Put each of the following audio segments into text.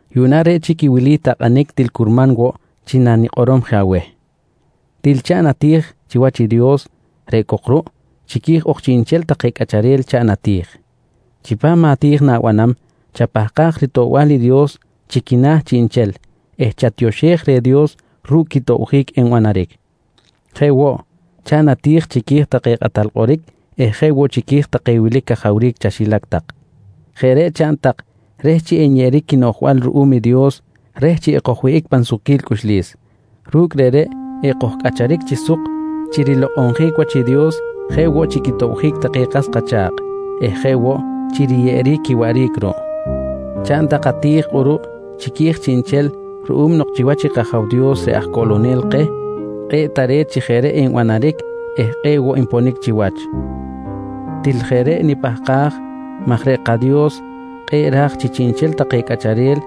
Yuꞌna reꞌ chic i wili takꞌanic til curman woꞌ chi nanikꞌorom je aweh: Til chaꞌn ati̱j chiwach i Dios. Reꞌ cok ruꞌ chiqui̱j ok chiꞌnchel take cꞌacharel chaꞌn ati̱j. Chipam ati̱j na̱banam, chapahkaj ritoꞌbal i Dios chi quina̱ chiꞌnchel eh chatioxej reh Dios ru̱cꞌ quitobjic enbanaric. Jeꞌ woꞌ, chaꞌn ati̱j tak chiqui̱j take kꞌatal kꞌoric eh jeꞌ woꞌ chiqui̱j take wilic cajawric chaxilac tak. Jeꞌ reꞌ chaꞌn tak reh chi enyeꞌeric quinoꞌjbal ruꞌum i Dios reh chi ekojwihꞌic pan sukquil cꞌuxlis. Ru̱cꞌ reꞌreꞌ ekojcꞌacharic chi suk chi rilokꞌonjic wach i Dios jeꞌ woꞌ chi quitobjic take kas kacha̱kꞌ eh jeꞌ woꞌ chi riyeꞌeric quiwaꞌric ruꞌ. Chaꞌn ati̱j tak kꞌuruꞌ chiqui̱j chiꞌnchel ruꞌum nok chiwach i kAja̱w Dios reꞌ aj Coꞌlonel keh, kꞌe̱ꞌ tare̱t chi jeꞌ reꞌ enbanaric eh kꞌe̱ꞌ woꞌ nponic chiwach. Til jeꞌ reꞌ nipahkaj maj reꞌ kaDios kꞌe̱ꞌ ra̱j chi chiꞌnchel take cꞌacharel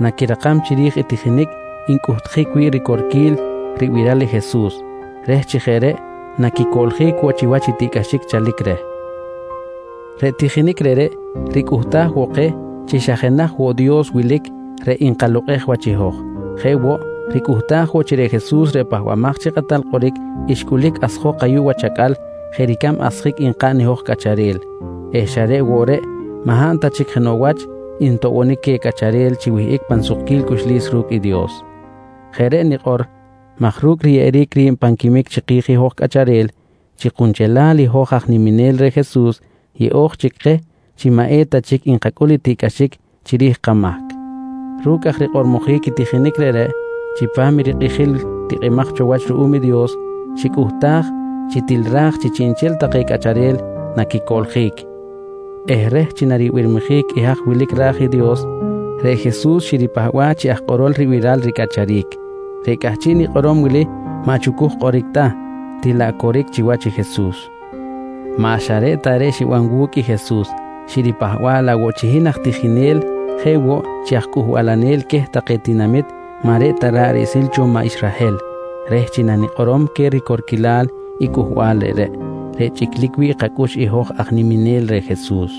naquirakam chiri̱j i tijinic ncꞌuhtjic wi̱ꞌ ricorquil ribiral i Jesus reh chi jeꞌ reꞌ naquicoꞌljic woꞌ chiwach i tiꞌcꞌaxic chalic reh. Reꞌ tijinic reꞌreꞌ ricꞌuhtaj woꞌ keh chi xa jenaj woꞌ Dios wilic reꞌ nkalokꞌej wach i hoj. Jeꞌ woꞌ, ricꞌuhtaj woꞌ chi reꞌ Jesus reꞌ Pahbamaj chi Kꞌatal Kꞌoric xcꞌulic asjok ayuꞌ wach acꞌal jeꞌ ricab asjic nkaꞌn i hoj cꞌacharel eh xa reꞌ woꞌ reꞌ maꞌ hab ta chic jenoꞌ wach ntoꞌbonic queh cꞌacharel chi wihꞌic pan sukquil cꞌuxlis ru̱cꞌ i Dios. Jeꞌ reꞌ nikꞌor maj ru̱cꞌ riyeꞌeric ri̱b pan quimic chiki̱j i hoj cꞌacharel, chi kunchelal i hoj aj niminel reh Jesus yeꞌo̱j chic keh chi maꞌ eta chic nkacꞌul i tiꞌcꞌaxic chiri̱j i kamahc. Ru̱cꞌ aj rikꞌormojic i tijinic reꞌreꞌ, chipam i rikꞌijil tikꞌimaj cho wach ruꞌum i Dios, xicꞌuhtaj chi til ra̱j chi chiꞌnchel take cꞌacharel naquicoꞌljic eh reh chi naribirmijic i haj wilic ra̱j i Dios, reꞌ Jesus xiripahba̱ꞌ chi aj kꞌorol ribiral ricꞌacharic. Reꞌ cꞌahchiꞌ nikꞌorom wili maꞌ chucuj kꞌoric ta, til laꞌ coric chiwach Jesus. Maꞌ xa reꞌ ta reꞌ xiban wu̱cꞌ i Jesus, xiripahba̱ꞌ laꞌ woꞌ chi hin aj tijinel jeꞌ woꞌ chi aj cꞌuhbalanel queh take tinamit maꞌ reꞌ ta ra̱ꞌ riꞌsil cho maꞌ Israhel reh chi nanikꞌorom queh ricorquilal i cꞌuhbal reꞌreꞌ, reꞌ chꞌiclic wi̱ꞌ kacꞌux i hoj aj niminel reh Jesus.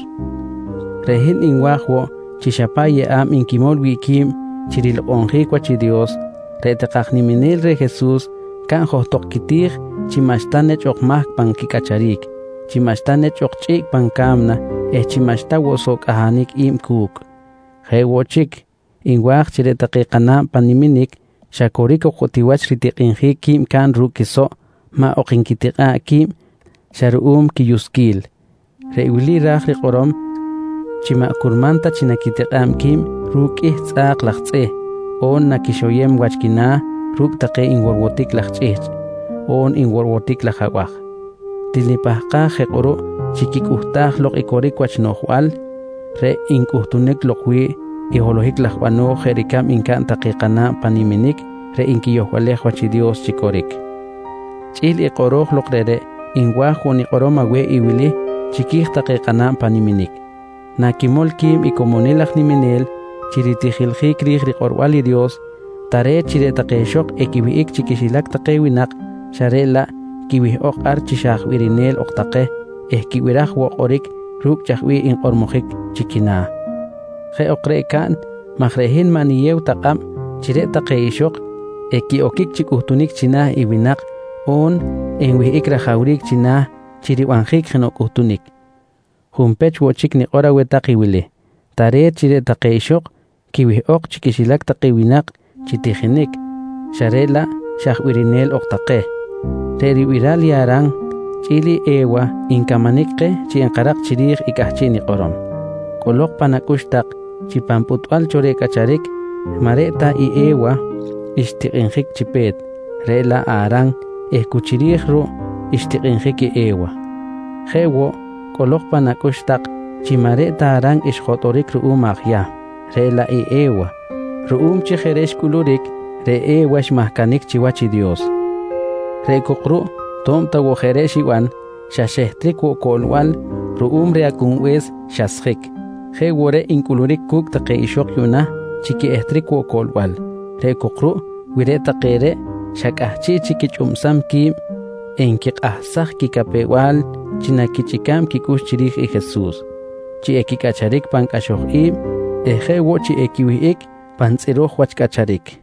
Reꞌ hin nwa̱j woꞌ chi xa paꞌ yeꞌa̱b nquimol wi̱ꞌ qui̱b chi rilokꞌonjic wach i Dios, reꞌ take aj niminel reh Jesus caꞌn johtok quiti̱j chi maꞌxta nechꞌ ok mahc pan quicꞌacharic, chi maꞌxta nechꞌ ok chꞌiꞌc pan ka̱mna eh chi maꞌxta woꞌ soꞌ cꞌahanic i̱b cu̱cꞌ. Jeꞌ woꞌ chic, nwa̱j chi reꞌ take kana̱b pan niminic xa coric ok woꞌ ti wach ritikꞌinjic qui̱b caꞌn ru̱cꞌ quisoꞌ maꞌ ok nquitikꞌa̱ꞌ qui̱b xa ruꞌum quiyusquil. Reꞌ wili ra̱j rikꞌorom chi maꞌ curman ta chi naquitikꞌa̱b qui̱b ru̱cꞌ qꞌuih tzꞌa̱k laj tzꞌih, on chi naquixoyem wach quina̱ ru̱cꞌ take nworwotic laj chꞌihchꞌ, on nworwotic laj abaj. Til nipahkaj je kꞌuruꞌ chi quicꞌuhtaj lok coric wach noꞌjbal reꞌ ncꞌutunic lok wi̱ꞌ i holohic laj bano̱j jeꞌ ricab ncaꞌn take kana̱b pan niminic reꞌ nquiyohbalej wach i Dios chi coric. Chꞌi̱l i kꞌoro̱j lok reꞌreꞌ, nwa̱j woꞌ nikꞌorom aweh i wili chiqui̱j take kana̱b pan niminic: Nanquimol qui̱b i comonil aj niminel chi ritijiljic ri̱j rikꞌorbal i Dios, tare̱t chi reꞌ take ixok equiwihꞌic chi quixilac take winak xa reꞌ laꞌ quiwihꞌok ar chi xa aj birinel ok take eh quibiraj woꞌ kꞌoric ru̱cꞌ chaj bih nkꞌormojic chi quina̱. Jeꞌ ok reꞌ caꞌn maj reꞌ hin maꞌ niyew ta kꞌab chi reꞌ take ixok equiꞌoquic chi cꞌuhtunic china̱ i winak on chi enwihꞌic rajawric china̱ chi ribanjic jenoꞌ cꞌuhtunic. Junpech woꞌ chic nikꞌor aweh tak i wili: Tare̱t chi reꞌ take ixok quiwihꞌok chi quixilac take winak chi tijinic xa reꞌ laꞌ xa birinel ok take. Reꞌ ribiral i Aran chꞌi̱l i E̱wa ncamanic keh chi enkarak chiri̱j i cꞌahchiꞌ nikꞌorom. Cꞌolok pan acꞌux tak chi pan pꞌutbal cho reh cꞌacharic maꞌ reꞌ ta E̱wa xtikꞌinjic chi pe̱t, reꞌ laꞌ Aran eh cu chiri̱j ruꞌ xtikꞌinjic i E̱wa. Jeꞌ woꞌ cꞌolok pan acꞌux tak chi maꞌ reꞌ ta Aran xjotꞌoric ruꞌum aj Yahm, reꞌ laꞌ i E̱wa. Ruꞌum chi jeꞌ reꞌ xcꞌuluric, reꞌ E̱wa xmahcanic chiwach i Dios. Reꞌ cok ruꞌ to̱b ta woꞌ jeꞌ reꞌ xiban, xa xehtric woꞌ coꞌlbal ruꞌum reh Acꞌunbe̱s xasjic. Jeꞌ woꞌ reꞌ ncꞌuluric cu̱cꞌ take ixok yuꞌna chi quiꞌehtric woꞌ coꞌlbal, reꞌ cok ruꞌ wi reꞌ take reꞌ xa cꞌahchiꞌ chic quichꞌubsam qui̱b enquikꞌahsaj quicapew-bal chi naquichꞌica̱b quicꞌux chiri̱j Jesus, chi equicꞌacharic pan cꞌaxoj i̱b eh jeꞌ woꞌ chi equiwihꞌic pan tzꞌiro̱j wach cꞌacharic.